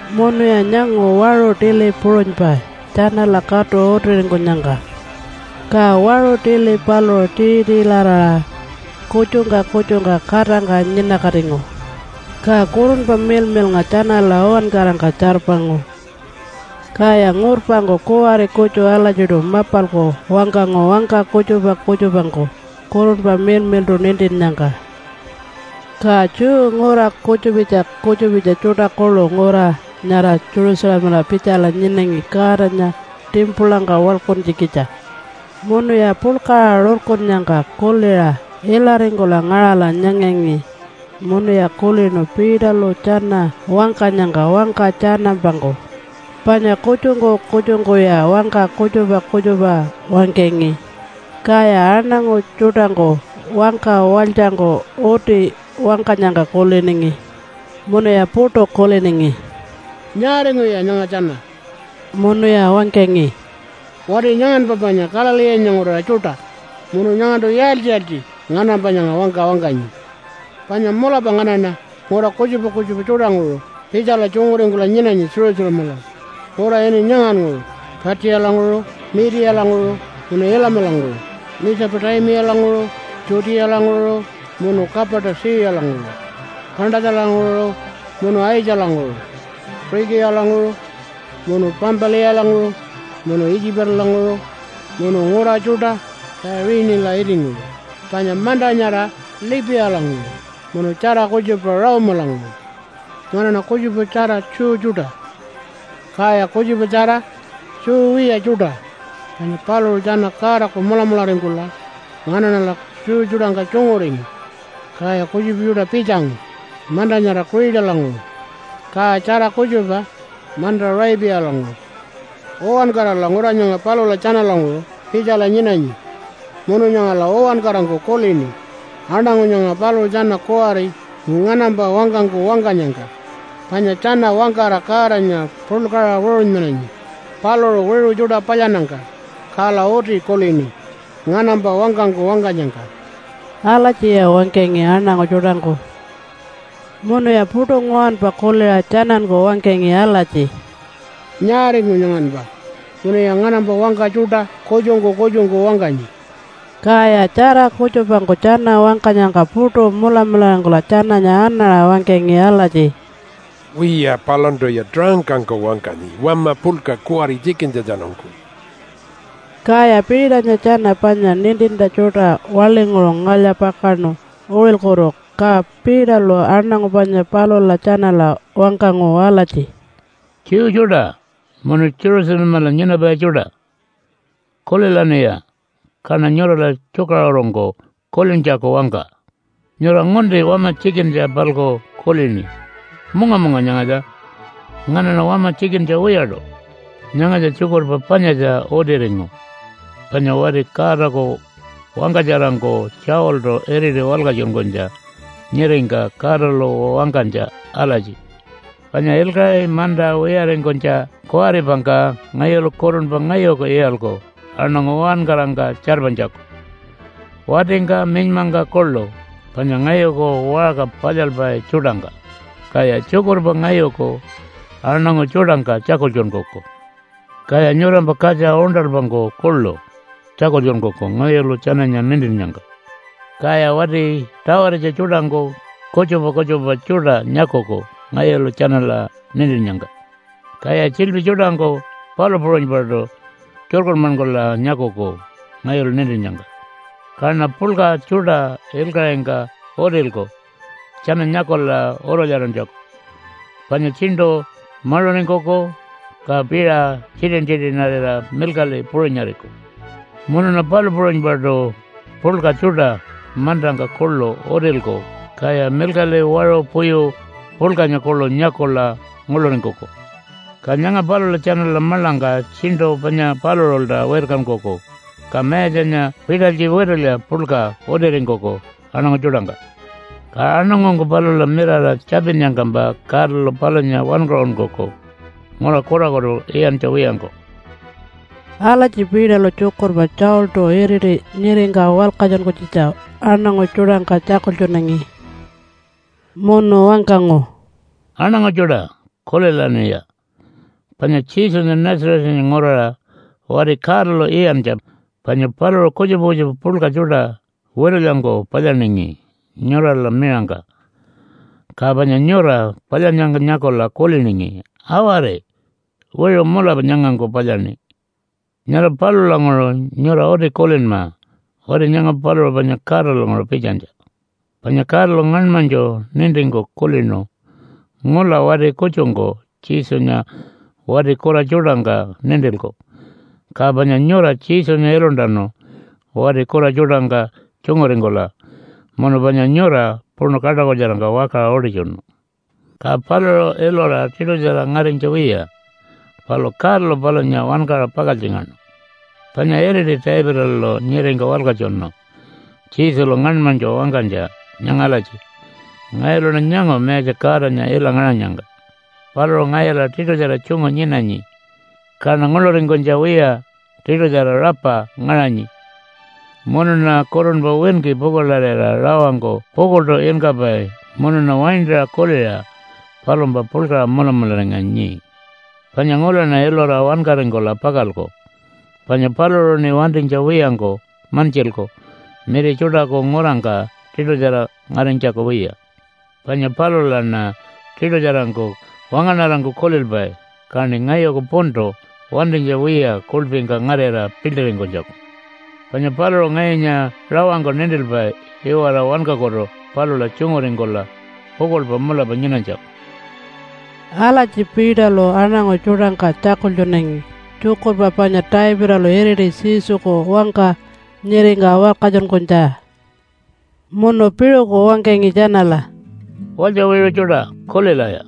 Munuya nyangu waṟu tili puṟunypa tjanala katu utiringkunyangka, ka waṟu tili paluṟu tii-tiilaraṟa kutjungka kutjungka katangka nyinakatingu. Ka Kurunpa Miḻmiḻnga tjanala uwankarangka tjarpangu. Kaya ngurpangku kuwari kutju alatjiṯu mapalku wangkangu wangka kutjupa kutjupangku Kurunpa Miḻmiḻṯu nintinnyangka. Ka Jew ngura kutjupitja kutjupitja tjuṯa kuḻu ngura nyara Jerusalemala pitjala nyinangi Godanya timpulangka waḻkuntjikitja. Munuya puḻkaṟa rurkunnyangka kuliṟa ilaringkula ngaṟala nyangangi munuya kulinu Peterlu tjana wangkanyangka wangka tjanampangku, panya kutjungku kutjungkuya wangka kutjupa kutjupa wangkangi, kaya aṉangu tjuṯangku wangka walytjangku uti wangkanyangka kuliningi. Munuya puṯu kuliningi, “Nyaaringuya nyanga tjana?” Munuya wangkangi, “Wati nyanganpa panya Galileenya nguraṟa tjuṯa. Munu nyangantu yaaltji-yaaltji nganampa nyanga wangka wangkanyi? Panya mulapa nganaṉa ngura kutjupa kutjupa tjuṯanguṟu pitjala tjunguringkula nyinanyi Jerusalemala, ngura ini nyangannguṟu Patjiyalanguṟu, Miitiyalanguṟu munu Ilamalanguṟu, Mitjupu-taimiyalanguṟu, Judealanguṟu munu Kapatu-tjiyalanguṟu, Pantatjalanguṟu munu Aitjalanguṟu, Puṟikiyalanguṟu munu Pampiliyalanguṟu munu Itjipalanguṟu munu ngura tjuṯa Tjaiṟinila itinguṟu panya manta nyara Lipiyalanguṟu, munu tjara kutjupa Rome-alanguṟu. Nganaṉa kutjupatjara Jew tjuṯa, kaya kutjupatjara Jew wiya tjuṯa panya paluṟu tjana Godaku mulamularingkula nganaṉala Jew tjuṯangka tjunguringu. Kaya kutjupa tjuṯa pitjangu manta nyara Kuṟitalanguṟu, ka tjara kutjupa manta Aṟaipiyalanguṟu. Uwankarala ngura nyanga palula tjanalanguṟu pitjala nyinanyi munu nyangala uwankarangku kulini aṉangu nyanga paluṟu tjana kuwari nganampa wangkangku wangkanyangka. Panya tjana wangkara Godanya puḻkaṟa wiṟunmananyi paluṟu wiṟu tjuṯa palyannyangka, kala uti kulini nganampa wangkangku wangkanyangka.” Alatjiya wangkangi aṉangu tjuṯangku. Munuya puṯu nguwanpa kuliṟa tjananku wangkangi alatji, “Nyaaringu nyanganpa munuya nganampa wangka tjuṯa kutjungku kutjungku wangkanyi?” Kaya tjara kutjupangku tjana wangkanyangka puṯu mulamularingkula tjananya anaṟa wangkangi alatji, “Wiya, palantuya taṟangkangku wangkanyi wama puḻka kuwari tjikintjatjanungku.” Kaya Peternya tjana panya nintintja tjuṯa waḻinguṟu ngalya-pakaṉu uṟilkutu ka Peterlu aṉangu panya palula tjanala wangkangu alatji, “Jew tjuṯa munu Jerusalemala nyinapai tjuṯa! Kulilaṉiya kaṉa nyurala tjukaṟurungku kulintjaku wangka! Nyura ngunti wama tjikintja-palku kulini. Munga-munga nyangatja. Nganaṉa wama tjikintja wiyaṯu. Nyangatja tjukurpa panyatja utiringu, panya wati Godaku wangkatjarangku Tjawiltu iriti walkatjunkunytja nyiringka Godalu wangkanytja alatji, ‘Panya ilkaṟi manta wiyaringkunytja kuwaripangka ngayulu kurunpa ngayuku iyalku aṉangu uwankarangka tjarpanytjaku, watingka minymangka kuḻu panya ngayuku waṟka palyalpai tjuṯangka, kaya tjukurpa ngayuku aṉangu tjuṯangka tjakultjunkuku. Kaya nyurampa katja uṉṯalpangku kuḻu tjakultjunkuku ngayulu tjananya nintinnyangka. Kaya wati tawaritja tjuṯangku kutjupa kutjupa tjuṯa nyakuku ngayulu tjanala nintinnyangka. Kaya tjiḻpi tjuṯangku palu puṟunypaṯu tjukurmankula nyakuku ngayulu nintinnyangka. Kaṉa puḻka tjuṯa ilkaṟingka utilku tjana nyakula urulyarantjaku, panya tjiṉṯu maṟuringkuku, ka piṟa tjitin-tjitinarira milkaḻi puṟunyariku. Munuṉa palu puṟunypaṯu puḻka tjuṯa mantangka kuḻu utilku kaya milkaḻi, waṟu puyu puḻkanya kuḻu nyakula nguḻuringkuku. Ka nyanga palula tjanala maḻangka tjiṉṯu panya paluṟulta wirkankuku, ka Mayatjanya pitalytji witulya puḻka utiringkuku aṉangu tjuṯangka. Ka aṉangungku palula mirara tjapinnyangkampa Godalu palunya wankaṟunkuku ngura kurakutu iyantja wiyangku.’” Alatji Peterlu tjukurpa Tjawiltu iriti nyiringka walkatjunkunytjitja aṉangu tjuṯangka tjakultjunangi. Munu wangkangu, “Aṉangu tjuṯa, kulilaṉiya! Panya Jesunya Nazarethanya nguraṟa wati Godalu iyantja, panya paluṟu kutjupa kutjupa puḻka tjuṯa witulyangku palyaningi nyurala miṟangka, ka panya nyura palyannyangka nyakula kuliningi, ‘Awari! Wiṟu mulapa nyangangku palyaṉi.’ Nyara palulanguṟu nyura uti kulinma wati nyanga paluṟu panya Godalanguṟu pitjanytja. Panya Godalu ngaṉmanytju nintingku kulinu ngula wati kutjungku Jesunya wati kura tjuṯangka nintilku, ka panya nyura Jesunya iluntanu wati kura tjuṯangka tjunguringkula munu panya nyura puṉu kaṯakutjarangka wakaṟa utitjunu. Ka paluṟu ilura tiṯutjara ngarinytja wiya. Palu Godalu palunya wankaṟa pakaltjingaṉu. Panya iriti Davidalu nyiringka walkatjunu Jesulu ngaṉmanytju wangkanytja nyanga alatji, ‘Ngayuluṉa nyangu Mayatja Godanya ila ngaṟanyangka. Paluṟu ngayula tiṯutjara tjungu nyinanyi, kaṉa nguḻuringkunytja wiya tiṯutjara rapa ngaṟanyi, munuṉa kurunpa winki pukuḻarira rawangku pukuḻṯu inkapai munuṉa waintaṟa kuliṟa palumpa puḻkaṟa mulamularinganyi. Panya ngulaṉa ilura wankaringkula pakalku, panya paluṟuṉi wantinytja wiyangku mantjilku miri tjuṯaku ngurangka tiṯutjara ngarinytjaku wiya. Panya palulaṉa tiṯutjarangku wangaṉarangku kulilpai, kaṉi ngayuku puntu wantinytja wiya kuḻpingka ngarira piḻṯiringkunytjaku. Panya paluṟu ngayunya rawangku nintilpai iwara wankakutu palula tjunguringkula pukuḻpa mulapa nyinanytjaku.’” Alatji Peterlu aṉangu tjuṯangka tjakultjunangi tjukurpa panya Davidalu iriti Jesuku wangka nyiringka walkatjunkunytja. Munu piṟuku wangkangi tjanala, “Walytja wiṟu tjuṯa kulilaya!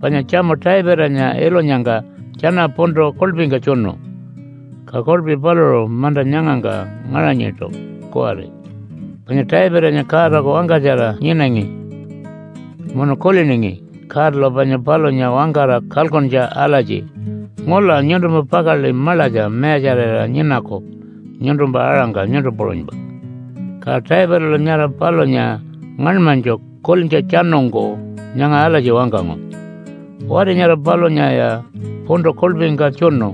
Panya tjamu Davidanya ilunyangka tjana puntu kuḻpingka tjunu, ka kuḻpi paluṟu manta nyangangka ngaṟanyiṯu kuwari. Panya Davidanya Godaku wangkatjara nyinangi munu kuliningi Godalu panya palunya wangkara kalkuntja alatji, ‘Ngula nyuntumpa pakaḻi maḻatja mayatjarira nyinaku nyuntumpa aṟangka nyuntu puṟunypa.’ Ka Davidalu nyara palunya ngaṉmanytju kulintjatjanungku nyanga alatji wangkangu, ‘Wati nyara palunyaya puntu kuḻpingka tjunu,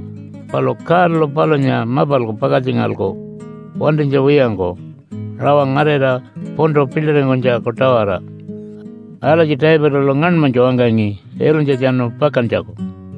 palu Godalu palunya mapalku pakaltjingalku wantinytja wiyangku rawa ngarira puntu piḻṯiringkunytjaku-tawara.’ Alatji Davidalu ngaṉmanytju wangkangi ilunytjatjanu pakantjaku.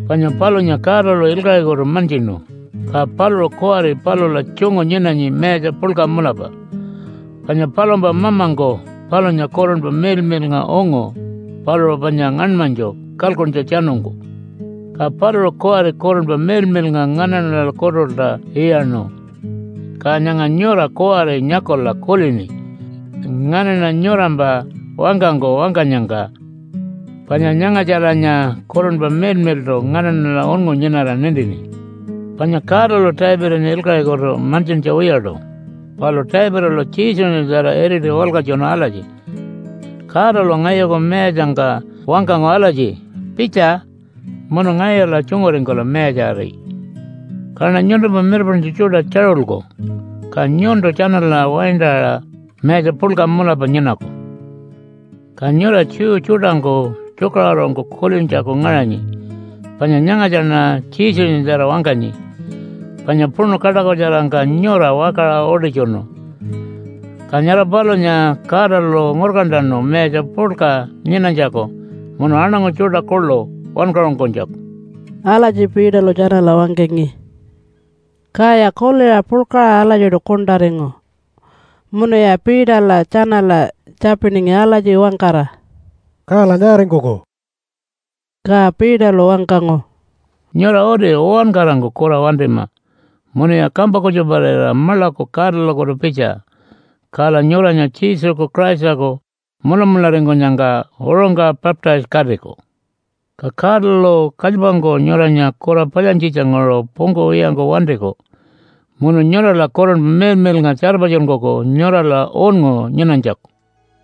Panya palunya Godalu ilkaṟikutu mantjinu, ka paluṟu kuwari palula tjungu nyinanyi mayatja puḻka mulapa. Panya palumpa Mamangku palunya Kurunpa Miḻmiḻnga ungu paluṟu panya ngaṉmanytju kalkuntjatjanungku. Ka paluṟu kuwari Kurunpa Miḻmiḻnga nganaṉalakutulta iyaṉu. Ka nyanga nyura kuwari nyakula kulini nganaṉa nyurampa wangkangku wangkanyangka, panya nyangatjalanya Kurunpa Miḻmiḻṯu nganaṉala unngu nyinara nintini. Panya Godalu Davidanya ilkaṟikutu mantjintja wiyaṯu, palu Davidalu Jesunyatjara iriti walkatjunu alatji, ‘Godalu ngayuku mayatjangka wangkangu alatji, “Pitja munu ngayula tjunguringkula mayatjari, kaṉa nyuntumpa mirpaṉtju tjuṯa tjaṟulku, ka nyuntu tjanala waintarira mayatja puḻka mulapa nyinaku.” ’ Ka nyura Jew tjuṯangku tjukaṟurungku kulintjaku ngaṟanyi, panya nyangatjaṉa Jesunyatjara wangkanyi, panya puṉu kaṯakutjarangka nyura wakaṟa utitjunu. Ka nyara palunya Godalu ngurkantanu mayatja puḻka nyinanytjaku munu aṉangu tjuṯa kuḻu wankaṟunkunytjaku.” Alatji Peterlu tjanala wangkangi. Kaya kuliṟa puḻkaṟa alatjiṯu kuṉṯaringu munuya Peterla tjanala tjapiningi alatji wangkara, “Kala nyaaringkuku?” Ka Peterlu wangkangu, “Nyura uti uwankarangku kura wantima munuya kampa kutjuparira maḻaku Godalakutu pitja, kala nyuranya Jesuku Christaku mulamularingkunyangka uṟungka baptise-katiku. Ka Godalu kalypangku nyuranya kura palyantjitjanguṟu pungkuwiyangku wantiku, munu nyurala Kurunpa Miḻmiḻnga tjarpatjunkuku nyurala unngu nyinanytjaku.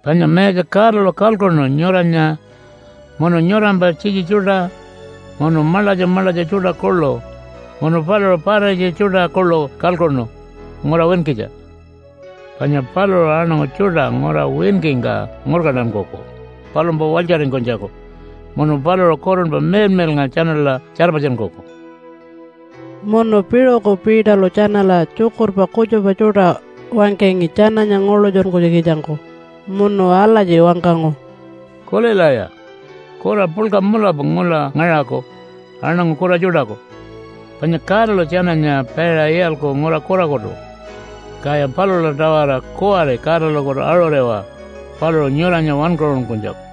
Panya Mayatja Godalu kalkuṉu nyuranya munu nyurampa tjitji tjuṯa, munu maḻatja maḻatja tjuṯa kuḻu, munu paluṟu pararitja tjuṯa kuḻu kalkuṉu ngura winkitja. Panya paluṟu aṉangu tjuṯa ngura winkingka ngurkantankuku palumpa walytjaringkunytjaku munu paluṟu Kurunpa Miḻmiḻnga tjanala tjarpatjunkuku.” Munu piṟuku Peterlu tjanala tjukurpa kutjupa tjuṯa wangkangi tjananya nguḻutjunkunytjikitjangku munu alatji wangkangu, “Kulilaya! Kura puḻka mulapa ngula ngaṟaku aṉangu kura tjuṯaku, panya Godalu tjananya paiṟa iyalku ngura kurakutu. Kaya palula-tawara kuwari Godalakutu aṟuriwa paluṟu nyuranya wankaṟunkunytjaku.”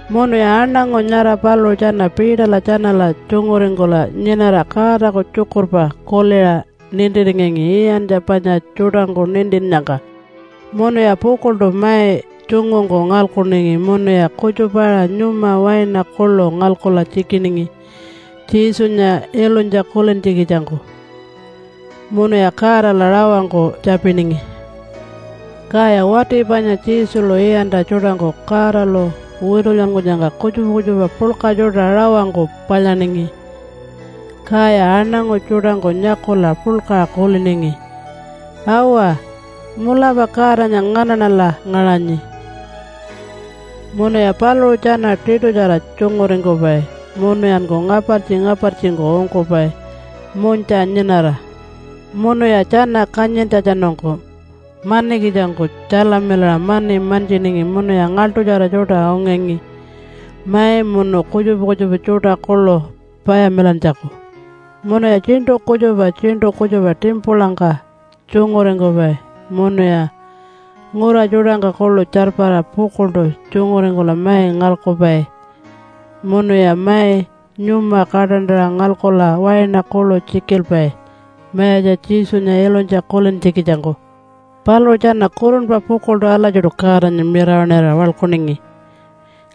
Munuya aṉangu nyara paluṟu tjana Peterla tjanala tjunguringkula nyinara Godaku tjukurpa kuliṟa nintiringangi iyantja panya tjuṯangku nintinnyangka. Munuya pukuḻṯu mai tjungungku ngalkuningi munuya kutjupa-aṟa nyuma waina kuḻu ngalkula tjikiningi Jesunya ilunytja kulintjikitjangku, munuya Godala rawangku tjapiningi. Kaya wati panya Jesulu iyantja tjuṯangku Godalu witulyankunyangka kutjupa kutjupa puḻka tjuṯa rawangku palyaningi, kaya aṉangu tjuṯangku nyakula puḻkaṟa kuliningi, “Awa! Mulapa Godanya nganaṉala ngaṟanyi.” Munuya paluṟu tjana tiṯutjara tjunguringkupai munuyanku ngapartji-ngapartjingku ungkupai munytja nyinara. Munuya tjana kanyintjatjanungku manikitjangku tjalamilaṟa mani mantjiningi munuya ngaḻṯutjara tjuṯa ungangi mai munu kutjupa kutjupa tjuṯa kuḻu payamilantjaku. Munuya tjiṉṯu kutjupa tjiṉṯu kutjupa timpulangka tjunguringkupai munuya ngura tjuṯangka kuḻu tjarpara pukuḻṯu tjunguringkula mai ngalkupai, munuya mai nyuma kaṯantaṟa ngalkula waina kuḻu tjikilpai Mayatja Jesunya ilunytja kulintjikitjangku. Paluṟu tjana kurunpa pukuḻṯu alatjiṯu Godanya mirawaṉira waḻkuningi.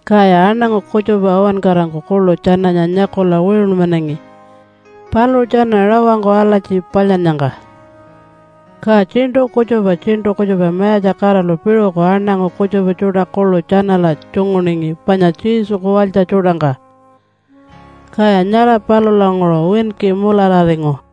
Kaya aṉangu kutjupa uwankarangku kuḻu tjananya nyakula wiṟunmanangi paluṟu tjana rawangku alatji palyannyangka. Ka tjiṉṯu kutjupa tjiṉṯu kutjupa Mayatja Godalu piṟuku aṉangu kutjupa tjuṯa kuḻu tjanala tjunguningi panya Jesuku walytja tjuṯangka, kaya nyara palulanguṟu winki mulararingu.